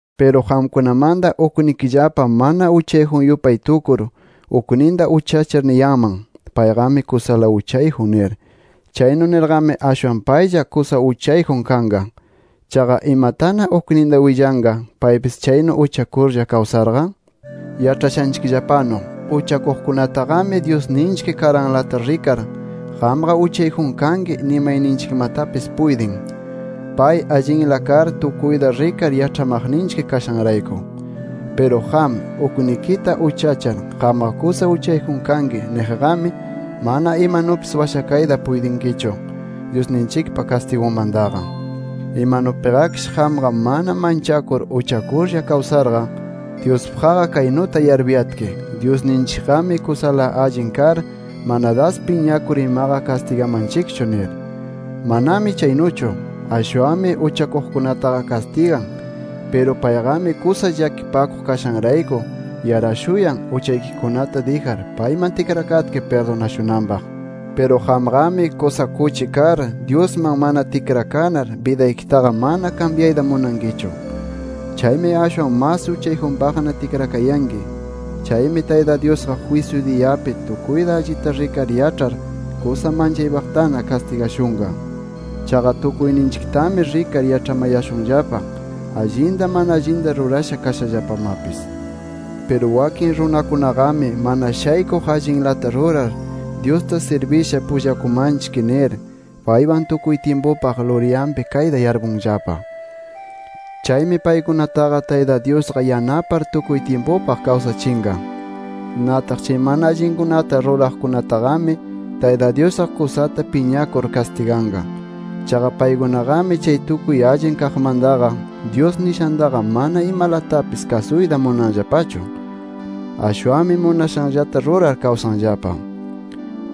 Piru qamkunamanta uknikillapa mana uchayjun yupay tukur, ukninta uchachar niyanman: “Payqami kusala uchayjun” nir. Chaynu nirqami, ashwan paylla kusa uchayjun kanqa. Chaqa ¿imatana ukninta willanqa paypis chaynu uchakurlla kawsarqa? Yaĉhashanchikllapanu, uchakuqkunataqami Dyusninchik karanlata rikar “Qamqa uchayjun kanki” nimayninchikmatapis puytin, pay allinla kar tukuyta rikar yaĉhamaqninchik kashanrayku. Piru qam, uknikita uchachar “Qamqa kusa uchayjun kanki” niqqami, mana imanupis washakayta puytinkichu, Dyusninchikpa kastigunmantaqa. Imanupiqakish qamqa mana manchakur uchakurlla kawsarqa, Dyuspaqqa kaynuta yarpuyatki: “Dyusninchikqami kusala allin kar, mana das piñakur imaqa kastigamanchikchu” nir. ¡Manami chaynuchu! Ashwanmi uchakuqkunataqa kastigan. Piru payqami kusa llakipakuq kashanrayku yarashuyan, uchaykikunata dijar payman tikrakatki pirdunashunanpaq. Piru qamqami, kusa kuchi kar, Dyusman mana tikrakanar bidaykitaqa mana kambyayta munankichu. Chaymi ashwan mas uchayjunpaqna tikrakayanki. Chaymi Tayta Dyusqa jwisyu diyapi tukuyta allita rikar yaĉhar, kusa manchaypaqtana kastigashunqa. Chaqa tukuyninchiktami rikar yaĉhamayashunllapa, allinta mana allinta rurasha kashallapamapis. Piru wakin runakunaqami mana shaykuq allinlata rurar, Dyusta sirbisha pullakumanchik nir, paywan tukuy tyimpupaq luryanpi kayta yarpunllapa. Chaymi paykunataqa Tayta Dyusqa yanapar tukuy tyimpupaq kawsachinqa. Nataq chay mana allinkunata ruraqkunataqami, Tayta Dyusqa kusata piñakur kastiganqa. Chaqa paykunaqami chay tukuy allin kaqmantaqa, Dyus nishantaqa mana imalatapis kasuyta munanllapachu. Ashwanmi munashanllata rurar kawsanllapa.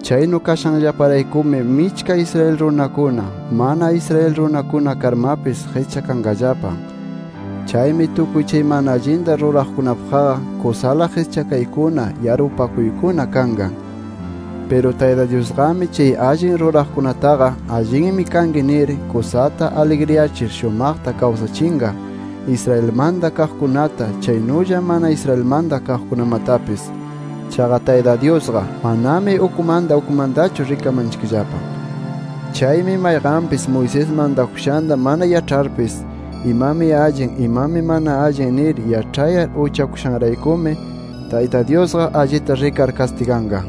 Chaynu kashanllaparaykumi michka Israel runakuna, mana Israel runakuna karmapis qischakanqallapa. Chaymi tukuy chay mana allinta ruraqkunapaqqa kusala qischakaykuna, yarpupakuykuna kanqa. Piru Tayta Dyusqami chay allin ruraqkunataqa allinmi kanki nir, kusata aligriyachir shumaqta kawsachinqa, Israelmanta kaqkunata, chaynulla mana Israelmanta kaqkunamatapis. Chaqa Tayta Dyusqa manami ukmanta, ukmantachu rikamanchikllapa. Chaymi mayqanpis Moisés mantakushanta mana yaĉharpis, imami allin, imami mana allin nir yaĉhayar uchakushanraykumi Tayta Dyusqa allita rikar kastiganqa.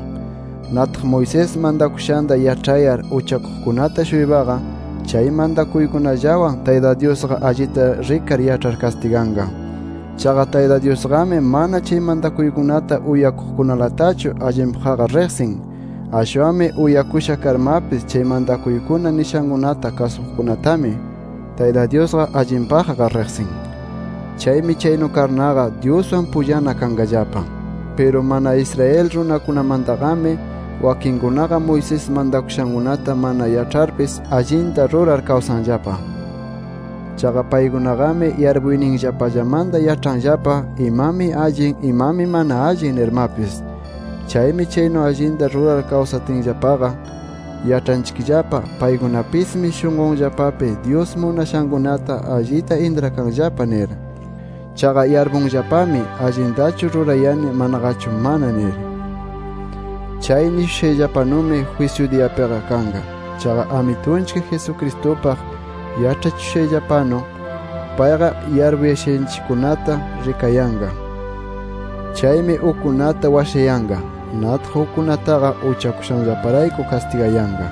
Nataq Moisés mantakushanta yaĉhayar uchakuqkunata-shuypaqa chay mantakuykunallawan Tayta Dyusqa allita rikar yaĉhar, kastiganqa. Chaqa Tayta Dyusqami mana chay mantakuykunata uyakuqkunalatachu allinpaqqa riqsin. Ashwanmi uyakusha karmapis chay mantakuykuna nishankunata kasuqkunatami, Tayta Dyusqa allinpaqqa riqsin. Chaymi chaynu karnaqa, Dyuswan pullana kanqallapa. Piru mana Israel runakunamantaqami, wakinkunaqa Moisés mantashankunata mana yaĉharpis, allinta rurar kawsanllapa. Chaqa paykunaqami yarpuyninllapallamanta yaĉhanllapa imami allin, imami mana allin nirmapis. Chaymi chaynu allinta rurar kawsatinllapaqa, yaĉhanchikllapa paykunapismi shunqunllapapi Dyus munashankunata allita intrakanllapa nir. Chaqa yarpunllapami, allintachu rurayani manaqachu mana nir. Chay nishushayllapanumi, jwisyu diyapiqa kanqa. Chaqa Amitunchik Jesucristupaq yaĉhachishushayllapanu, payqa yarpuyashanchikkunata rikayanqa. Chaymi ukkunata washayanqa. Nataq ukkunataqa uchakushanllaparayku kastigayanqa.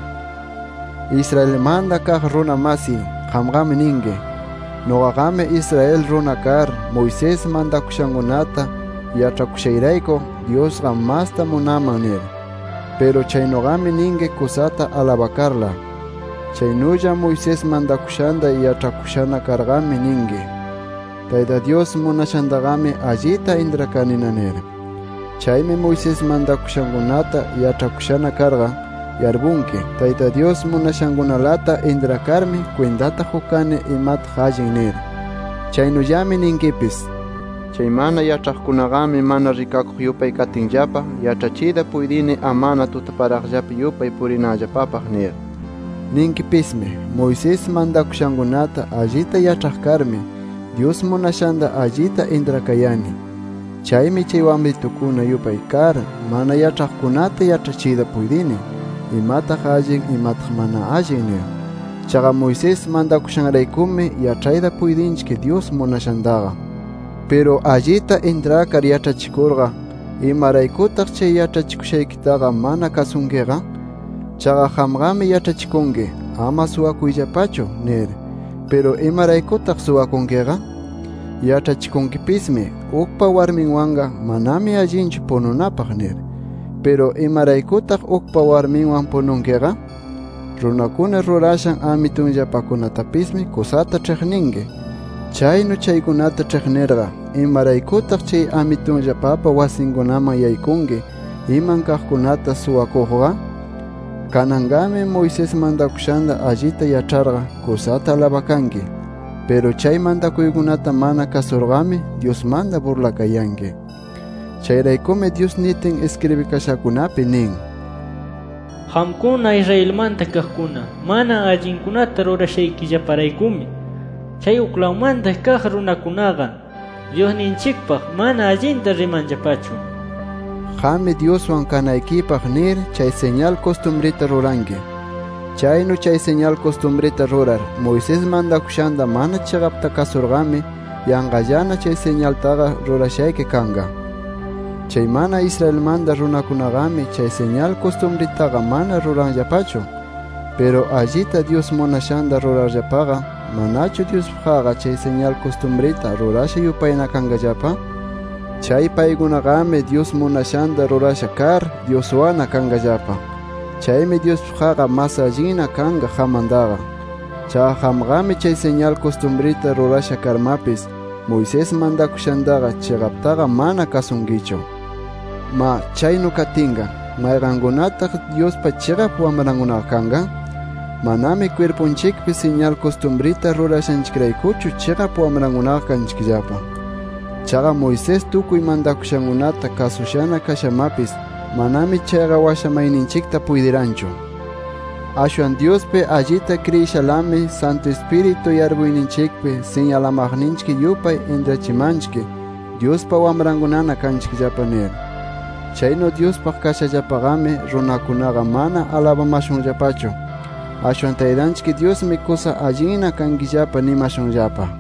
Israelmanta kaq runa masiy, qamqami ninki: “Nuqaqami Israel runa kar, Moisés mantakushankunata yaĉhakushayrayku Dyusqa masta munaman” nir. Piru chaynuqami ninki kusata alabakarla. Chaynulla Moisés mantakushanta yaĉhakushana karqami ninki, “Tayta Dyus munashantaqami allita intrakanina” nir. Chaymi Moisés mantakushankunata yaĉhakushana karqa, yarpunki Tayta Dyus munashankunalata intrakarmi, kwintata qukani imataq allin nir. Chaynullami ninkipis: “Chay mana yaĉhaqkunaqami mana rikakuq yupay katinllapa, yaĉhachiyta puytini, amana tutaparaqllapi yupay purinanllapapaq” nir. Ninkipismi: “Moisés mantakushankunata allita yaĉhaq karmi, Dyus munashanta allita intrakayani. Chaymi chay wamritukuna yupay kar, mana yaĉhaqkunata yaĉhachiyta puytini: ‘Imataq allin, imataq mana allin’ nir. Chaqa Moisés mantakushanraykumi yaĉhayta puytinchik Dyus munashantaqa”. Piru allita intrakar yaĉhachikurqa, ¿imaraykutaq chay yaĉhachikushaykitaqa mana kasunkiqa? Chaqa qamqami yaĉhachikunki: “Ama suwakuyllapachu” nir. Piru ¿imaraykutaq suwakunkiqa? Yaĉhachikunkipismi: “Ukpa warminwanqa manami allinchu pununapaq” nir. Piru, ¿imaraykutaq ukpa warminwan pununkiqa? Runakuna rurashan amitunllapakunatapismi kusata ĉhiqninki. Chaynu chaykunata ĉhiqnirqa, ¿imaraykutaq chay amitunllapapa wasinkunaman yaykunki iman kaqkunata suwakuqqa? Kananqami Moisés mantakushanta allita yaĉharqa, kusata alabakanki. Piru chay mantakuykunata mana kasurqami, Dyusmanta burlakayanki. Chayraykumi Dyus nitin iskribikashakunapi nin: “Qamkuna Israelmanta kaqkuna mana allinkunata rurashaykillaparaykumi, chay uklawmanta kaq runakunaqa, Dyusninchikpaq mana allinta rimanllapachu” nir. Qammi Dyuswan kanaypaq nir chay siñal kustumrita ruranki. Chaynu chay siñal kustumrita rurar, Moisés mantakushanta mana chiqapta kasurqami, yanqallana chay siñaltaqa rurashayki kanqa. Chay mana Israelmanta runakunaqami chay siñal kustumritaqa mana ruranllapachu. Piru allita Dyus munashanta rurarllapaqa, ¿manachu Dyuspaqqa chay siñal kustumrita rurasha yupayna kanqallapa? Chay paykunaqami, Dyus munashanta rurasha kar, Dyuswanna kanqallapa. Chaymi Dyuspaqqa mas allinna kanqa qammantaqa. Chaqa qamqami, chay siñal kustumrita rurasha karmapis, Moisés mantakushantaqa chiqaptaqa mana kasunkichu. Ma chaynu katinqa ¿mayqankunataq Dyuspa chiqap wamrankunaqa kanqa? Manami kwirpunchikpi siñal kustumrita rurashanchikraykuchu chiqap wamrankunaqa kanchikllapa. Chaqa Moisés tukuy mantakushankunata kasunasha kashamapis, manami chayqa washamayninchikta puytiranchu. Ashwan Dyuspi allita kriyishalami, Santu Ispiritu yarpuyninchikpi siñalamaqninchik yupay intrachimanchik Dyuspa wamrankunana kanchikllapa nir. Chaynu Dyuspaq kashallapaqami, runakunaqa mana alabamashunllapachu, ashwan Taytanchik Dyusmi kusa allinna kankillapa nimashunllapa.